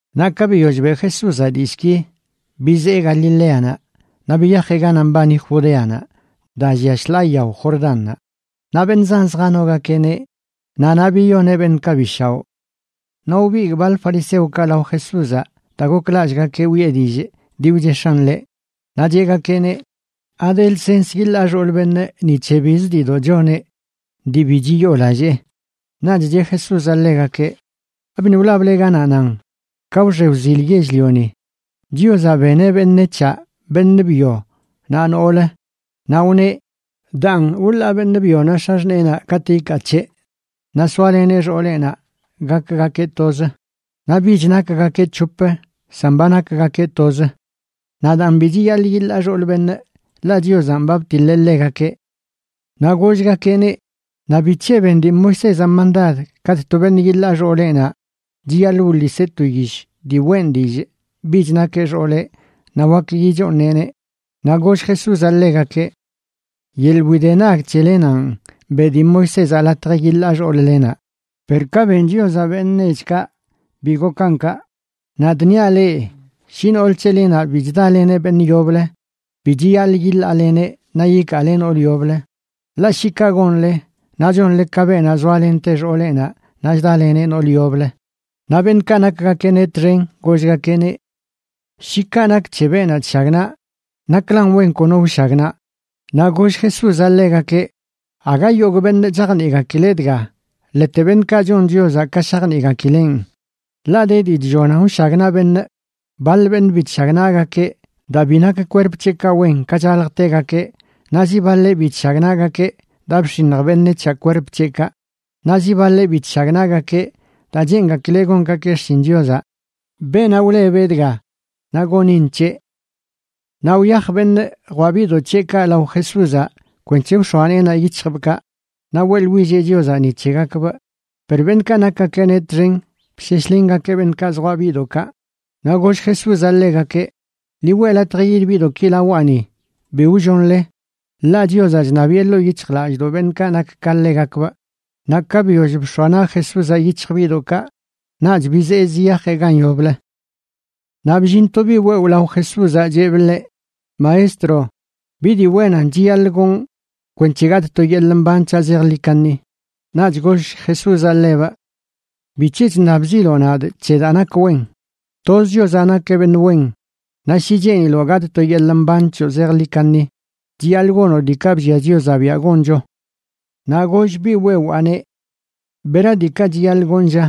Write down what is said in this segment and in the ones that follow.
Naꞌ ka biyoll beꞌ Jesúzaꞌ dillꞌki, bizee Galileanaꞌ naꞌ biyajeꞌ ganaꞌ mbani Judeanaꞌ daa llia shḻaa yao Jordánnaꞌ. Naꞌ beṉꞌ zan zjanogakeꞌneꞌ, naꞌ naꞌ biyoneꞌ beṉꞌkaꞌ bi shaoꞌ. Naꞌ wbigꞌ baḻ fariseokaꞌ lao Jesúzaꞌ daa goklallꞌgakeꞌ wiꞌe dillꞌ dii wchix̱aꞌn ḻeꞌ, naꞌ cheꞌgakeꞌneꞌ: ―¿Ade lsens yiḻaa xool beṉꞌ ni c̱he bizə diidoꞌ choneꞌ dii bi chiyoolallee? Naꞌch cheꞌ Jesúzaꞌ ḻegakeꞌ: ―¿Abiṉꞌ wlable ganaꞌ nan ka wxe wzil yell-lioni Chiozaꞌ beneꞌ beṉec̱haꞌ, beṉꞌ byo naꞌ noolə? Naꞌ wneꞌ: “Daan, wḻaa beṉꞌ byonaꞌ x̱axṉeenaꞌ katꞌ ikaa c̱heꞌ, naꞌ soaleneꞌ xooleꞌnaꞌ gakgakeꞌ toz.” Naꞌ bich nakgakeꞌ c̱hop, san ba nakgakeꞌ toz. Naꞌ daan bi chiyaḻꞌ yiḻaa xool beṉꞌ, ḻaꞌ Chiozanꞌ ba btiḻeꞌ ḻegakeꞌ. Naꞌ gollgakeꞌneꞌ: ―Naꞌ ¿bic̱he ben dii Moisézaꞌ mandad katꞌ to beṉꞌ yiḻaa xooleꞌnaꞌ chiyaḻꞌ wḻiseꞌ to yish dii weꞌn dillꞌ bich nakeꞌ xooleꞌ naꞌ wak yichooṉeꞌneꞌ? Naꞌ goll Jesúzaꞌ ḻegakeꞌ: ―Yeḻꞌ widenag c̱helenanꞌ beꞌ dii Moisézaꞌ latj yiḻaa xool-lenaꞌ. Per ka ben Chiozaꞌ beṉꞌ nechkaꞌ, bi gokan kaꞌ. Nadꞌ niaꞌ leꞌ, shi nool c̱helenaꞌ bi chdaleneꞌ beṉꞌ yoblə, bi chiyaḻꞌ yiḻaaleneꞌ naꞌ yikaale nool yoblə, ḻaꞌ shi kaꞌ gonle, naꞌ chonle ka beenaꞌ zoalente xooleꞌnaꞌ naꞌ chdaleneꞌ noolə yoblə. Naꞌ beṉꞌkaꞌ nakgakeꞌneꞌ txen gollgakeꞌneꞌ: ―Shi kaꞌ nak c̱he beenaꞌ chshagnaꞌ, naklan wen kono wshagnaꞌ. Naꞌ goll Jesúzaꞌ ḻegakeꞌ: ―Aga yogꞌ beṉꞌ chajniꞌgakileꞌ dga, ḻete beṉꞌkaꞌ chon Chiozaꞌ ka shajniꞌgakileꞌn. Ḻaꞌ de dii chllonan wshagnaꞌ beṉꞌ. Baḻ beṉꞌ bi chshagnaꞌgakeꞌ daa bi nak kwerp c̱heꞌkaꞌ wen ka chaljtegakeꞌ, naꞌ zi baḻeꞌ bi chshagnaꞌgakeꞌ daa bx̱iṉj beṉec̱haꞌ kwerp c̱heꞌkaꞌ. Naꞌ zi baḻeꞌ bi chshagnaꞌgakeꞌ daa cheenchgakileꞌ gongakeꞌ xshin Chiozaꞌ. Beenaꞌ wlebeꞌ dga, naꞌ gonin c̱heꞌ. Naꞌ wyaj beṉꞌ jwaꞌ biꞌdoꞌ c̱heꞌkaꞌ lao Jesúzaꞌ kwenc̱he wx̱oa neenaꞌ yic̱hjbꞌkaꞌ naꞌ weꞌḻwilleꞌ Chiozaꞌ ni c̱hegakbꞌ. Per beṉꞌkaꞌ nakgakeꞌneꞌ txen bsheshlengakeꞌ beṉꞌkaꞌ zjwaꞌ biꞌdoꞌkaꞌ. Naꞌ goll Jesúzaꞌ ḻegakeꞌ: ―Ḻi weꞌ latj yid biꞌdoꞌki lawaꞌni, bi wllonle, ḻaꞌ Chiozaꞌ chṉabiꞌe ḻoo yic̱hjlallꞌdoꞌ beṉꞌkaꞌ nak ka ḻegakbꞌ. Naꞌ ka biyoll bx̱oa naꞌ Jesúzaꞌ yic̱hj biꞌdoꞌkaꞌ, naꞌch bizee ziyajeꞌ gan yoblə. Naꞌ bllin to biꞌ wewꞌ lao Jesúzaꞌ cheꞌbꞌ ḻeꞌ: ―Maestro, ¿bi dii wennanꞌ chiyaḻꞌ gonꞌ kwenc̱he gatꞌ to yeḻꞌ mban c̱haꞌ zejḻi kaṉi? Naꞌch goll Jesúzaꞌ ḻebꞌ: ―¿Bic̱he chṉabziloꞌ nadꞌ c̱he daa nak wen? Toz Chiozaꞌ nakeꞌ beṉꞌ wen. Naꞌ shi cheeniloꞌ gatꞌ to yeḻꞌ mban c̱hoꞌ zejḻi kaṉi, chiyaḻꞌ gonoꞌ diikaꞌ bllia Chiozaꞌ biaꞌ goncho. Naꞌ goll biꞌ wewaaneꞌ: ―¿Bera diikaꞌ chiyaḻꞌ gonꞌ, lla?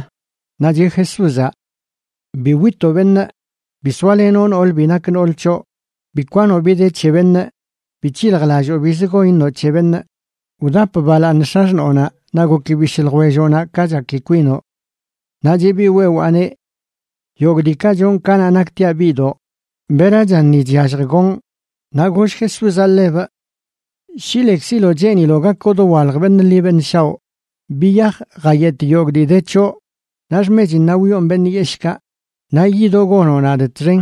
Naꞌ cheꞌ Jesúzaꞌ: ―Bi witoꞌ beṉꞌ, bi soalenoꞌ nool bi nak nool c̱hoꞌ, bi kwanoꞌ bi de c̱he beṉꞌ, bi c̱hiljlalloo bizə gon iṉoꞌ c̱he beṉꞌ. Wdap balaaṉ x̱axṉoonaꞌ naꞌ goki bishꞌ ljwelloꞌnaꞌ ka chaki kwinoꞌ. Naꞌ cheꞌ biꞌ wewaaneꞌ: ―Yogꞌ diikaꞌ chonꞌ kanaꞌ naktiaꞌ biꞌdoꞌ. ¿Berachan ni chyallj gonꞌ? Naꞌ goll Jesúzaꞌ ḻebꞌ: ―Shi lekziloꞌ cheeniloꞌ gakoꞌ dowalj beṉꞌ ḻi beṉꞌ shaoꞌ, biyaj jayetꞌ yogꞌ dii de c̱hoꞌ naꞌ xmechinnaꞌ wyoon beṉꞌ yeshꞌkaꞌ, naꞌ yidoꞌ gonoꞌ nadꞌ txen.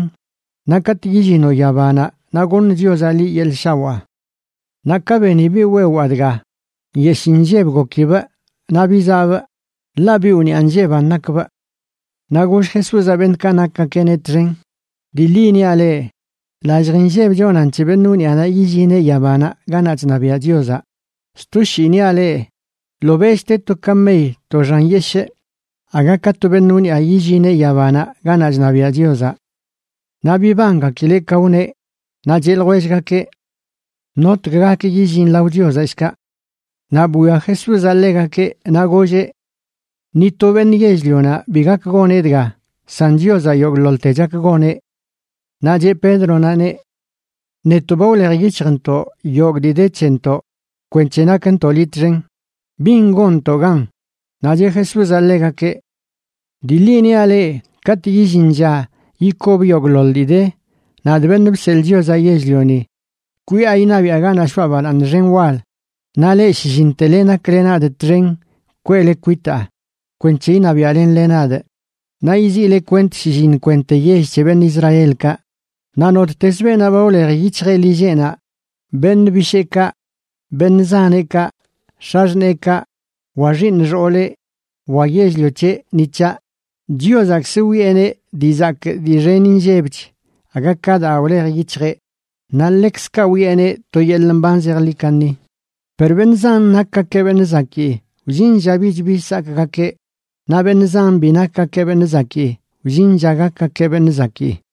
Naꞌ katꞌ yillinoꞌ yabanaꞌ naꞌ goṉ Chiozaꞌ liꞌ yeḻꞌ shawaa. Naꞌ ka beni biꞌ wewaa dga, nyeshꞌ inlleb gokibꞌ naꞌ bizaꞌbꞌ, ḻaꞌ biꞌ wniꞌa nlleban nakbꞌ. Naꞌ goll Jesúzaꞌ beṉꞌkaꞌ nakgakeꞌneꞌ txen: ―Dii ḻi niaꞌ leꞌ, lallj inlleb chonan c̱he beṉꞌ wniꞌanaꞌ yillineꞌ yabanaꞌ ganaꞌ chṉabiaꞌ Chiozaꞌ. Sto shii niaꞌ leꞌ, ḻobeꞌch te to kamey to xan yeshꞌ aga ka to beṉꞌ wniꞌa yillineꞌ yabanaꞌ ganaꞌ chṉabiaꞌ Chiozaꞌ. Naꞌ bibangakileꞌ ka wneꞌ, naꞌ cheꞌ ljwellgakeꞌ: ―¿Notg gak yillin lao Chiozaꞌ, shkaꞌ? Naꞌ bwia Jesúzaꞌ ḻegakeꞌ, naꞌ golleꞌ: ―Ni to beṉꞌ yell-lionaꞌ bi gak goneꞌ dga, san Chiozaꞌ yogꞌḻoḻte chak goneꞌ. Naꞌ cheꞌ Pédronaꞌneꞌ: ―Netoꞌ ba wlej yic̱hjntoꞌ yogꞌ dii de c̱hentoꞌ kwenc̱he nakntoꞌ liꞌ txen. ¿Bin gonntoꞌ gan? Naꞌ cheꞌ Jesúzaꞌ ḻegakeꞌ: ―Dii ḻi niaꞌ leꞌ, katꞌ illin lla yikob yogꞌḻoḻ dii de, nadꞌ, Beṉꞌ Bseḻꞌ Chiozaꞌ Yell-lioni, kwiꞌa iṉabiꞌa ganaꞌ shoꞌa balaaṉ xen wal, naꞌ leꞌ, shlliṉtele, nakle nadꞌ txen kweꞌle kwitaa kwenc̱he iṉabiaꞌlenle nadꞌ. Naꞌ yiziꞌle kwent shlliṉ kwente yell c̱he beṉꞌ Israelkaꞌ. Naꞌ nottez beenaꞌ ba wlej yic̱hjeꞌ lilleꞌnaꞌ, beṉꞌ bisheekaꞌ, beṉꞌ zaneꞌkaꞌ, x̱axṉeekaꞌ, wa xiiṉ xooleꞌ, wa yell-lio c̱heꞌ ni c̱haꞌ, Chiozaꞌkzə wiꞌeneꞌ dii zakꞌ dii xen inllebch aga ka daa wlej yic̱hjeꞌ, naꞌ ḻekzkaꞌ wiꞌeneꞌ to yeḻꞌ mban zejḻi kaṉi. Per beṉꞌ zan nakgakeꞌ beṉꞌ zakii, wllin lla bich bi sakꞌgakeꞌ, naꞌ beṉꞌ zan bi nakgakeꞌ beṉꞌ zakii, wllin lla gakgakeꞌ beṉꞌ zakii.